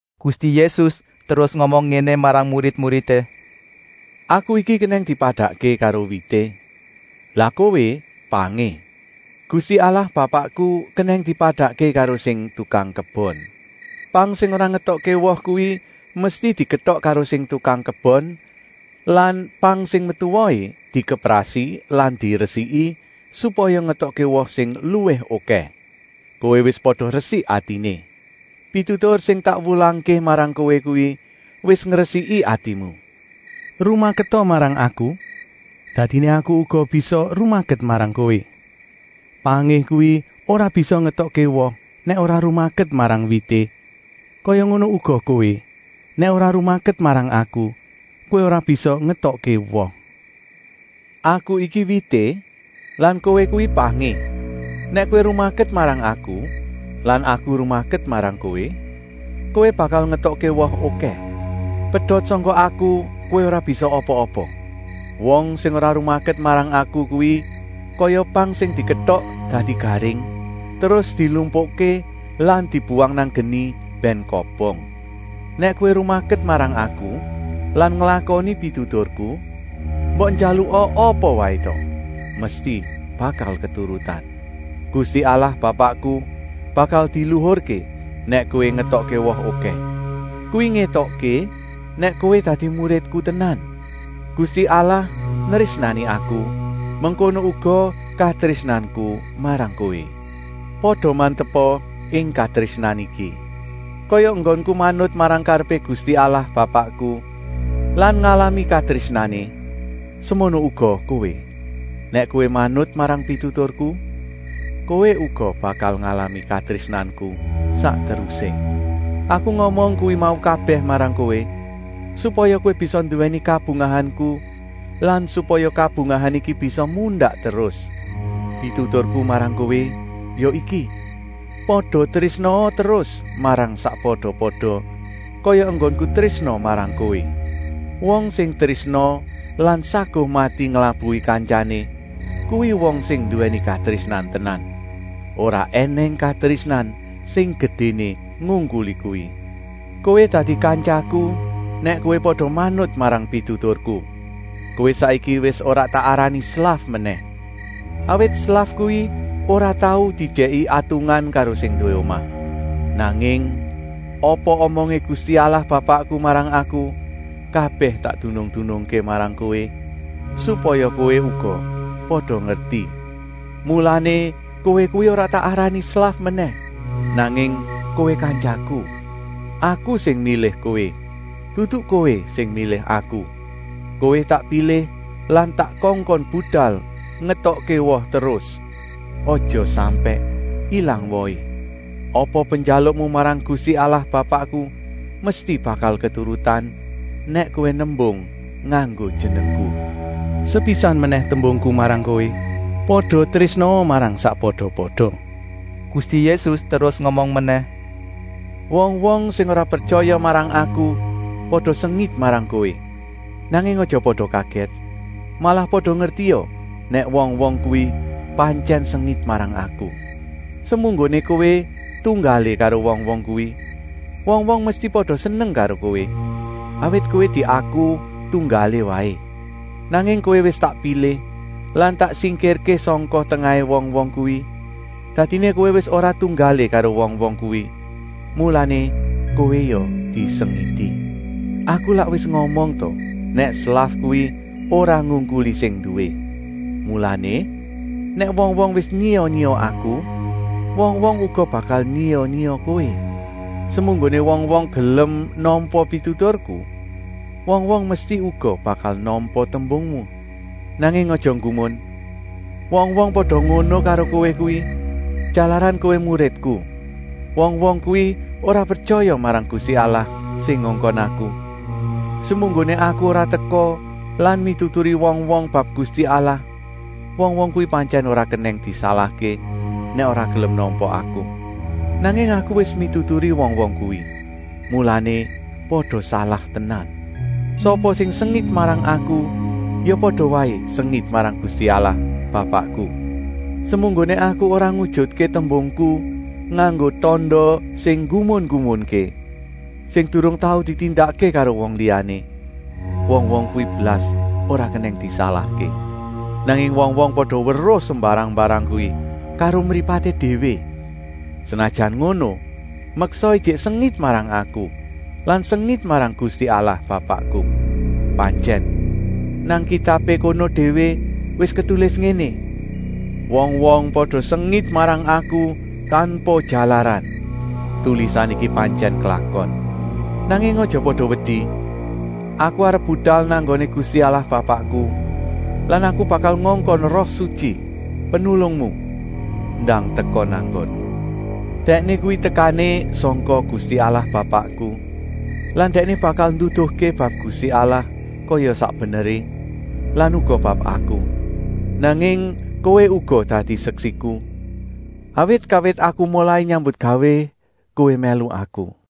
Gusti Yésus terus ngomong ngéné marang murid-muridé: “Aku iki kenèng dipadakké karo wité, lah kowé pangé. Gusti Allah Bapakku kenèng dipadakké karo sing tukang kebon. Pang sing ora ngetokké woh kuwi mesti diketok karo sing tukang kebon lan pang sing metu wohé dikeprasi lan diresiki supaya ngetokké woh sing luwih okèh. Kowé wis pada resik atiné. Pitutur sing tak wulangké marang kowé kuwi wis ngresiki atimu. Rumaketa marang Aku, dadiné Aku uga bisa rumaket marang kowé. Pangé kuwi ora bisa ngetokké woh nèk ora rumaket marang wité, kaya ngono uga kowé, nèk ora rumaket marang Aku kowé ora bisa ngetokké woh. “Aku iki wité lan kowé kuwi pangé. Nèk kowé rumaket marang Aku lan Aku rumaket marang kowé, kowé bakal ngetokké woh okèh. Pedot sangka Aku kowé ora bisa apa-apa. Wong sing ora rumaket marang Aku kuwi kaya pang sing diketok dadi garing, terus dilumpukké lan dibuwang nang geni bèn kobong. Nèk kowé rumaket marang Aku lan nglakoni pituturku, mbok njaluka apa waé ta, mesti bakal keturutan. Gusti Allah Bapakku bakal diluhurké nèk kowé ngetokké woh okèh. Kuwi ngétokké nèk kowé dadi muridku tenan. Gusti Allah nrésnani Aku, mengkono uga katrésnanku marang kowé. Pada mantepa ing katrésnan iki. Kaya enggonku manut marang karepé Gusti Allah Bapakku lan ngalami katrésnané, semono uga kowé. Nèk kowé manut marang pituturku, kowé uga bakal ngalami katrésnanku sak terusé. “Aku ngomong kuwi mau kabèh marang kowé, supaya kowé bisa nduwèni kabungahanku lan supaya kabungahan iki bisa mundak terus. Pituturku marang kowé ya iki: pada trésnaa terus marang sakpada-pada kaya enggonku trésna marang kowé. Wong sing trésna lan saguh mati nglabuhi kantyané, kuwi wong sing nduwèni katrésnan tenan. Ora ènèng katrésnan sing gedéné ngungkuli kuwi. Kowé dadi kantyaku nèk kowé pada manut marang pituturku. Kowé saiki wis ora tak arani slaf menèh, awit slaf kuwi ora tau diejèki atungan karo sing nduwé omah. Nanging apa omongé Gusti Allah Bapakku marang Aku, kabèh tak dunung-dunungké marang kowé, supaya kowé uga pada ngerti. Mulané kowé kuwi ora tak arani slaf menèh, nanging kowé kantyaku. Aku sing milih kowé, dudu kowé sing milih Aku. Kowé tak pilih lan tak kongkon budal ngetokké woh terus, aja sampèk ilang wohé. Apa penjalukmu marang Gusti Allah Bapakku mesti bakal keturutan nèk kowé nembung nganggo Jenengku.” Sepisan menèh tembungku marang kowé: “Pada trésnaa marang sakpada-pada.” Gusti Yésus terus ngomong menèh: “Wong-wong sing ora pretyaya marang Aku pada sengit marang kowé. Nanging aja pada kagèt, malah pada ngertia nèk wong-wong kuwi pantyèn sengit marang Aku. Semunggoné kowé tunggalé karo wong-wong kuwi, wong-wong mesti pada seneng karo kowé, awit kowé diaku tunggalé waé. Nanging kowé wis tak pilih lan tak singkirké sangka tengahé wong-wong kuwi, dadiné kowé wis ora tunggalé karo wong-wong kuwi, mulané kowé ya disengiti. Aku lak wis ngomong ta nèk slaf kuwi ora ngungkuli sing nduwé. Mulané, nèk wong-wong wis nyiya-nyiya Aku, wong-wong uga bakal nyiya-nyiya kowé. Semunggoné wong-wong gelem nampa pituturku, wong-wong mesti uga bakal nampa tembungmu. Nanging aja nggumun, wong-wong pada ngono karo kowé kuwi, jalaran kowé muridku. Wong-wong kuwi ora pretyaya marang Gusti Allah sing ngongkon Aku. Semunggoné Aku ora teka lan mituturi wong-wong bab Gusti Allah, wong-wong kuwi pantyèn ora kenèng disalahké nèk ora gelem nampa Aku. Nanging Aku wis mituturi wong-wong kuwi, mulané pada salah tenan. Sapa sing sengit marang Aku ya pada waé sengit marang Gusti Allah Bapakku. Semunggoné Aku ora ngujutké tembungku nganggo tanda sing nggumun-nggumunké, sing durung tau ditindakké karo wong liyané, wong-wong kuwi blas ora kenèng disalahké. Nanging wong-wong pada weruh sembarang-mbarang kuwi karo mripaté déwé, senajan ngono meksa ijik sengit marang Aku lan sengit marang Gusti Allah Bapakku. Pantyèn, nang kitabé kono déwé wis ketulis ngéné: ‘Wong-wong pada sengit marang Aku tanpa jalaran.’ Tulisan iki pantyèn klakon. “Nanging aja pada wedi, Aku arep budal nang nggoné Gusti Allah Bapakku lan Aku bakal ngongkon Roh Sutyi, Penulungmu, ndang teka nang nggonmu. Dèkné kuwi tekané sangka nggoné Gusti Allah Bapakku lan Dèkné bakal nduduhké bab Gusti Allah kaya sak beneré lan uga bab Aku. Nanging kowé uga dadi seksiku, awit kawit Aku molai nyambutgawé kowé mèlu Aku.”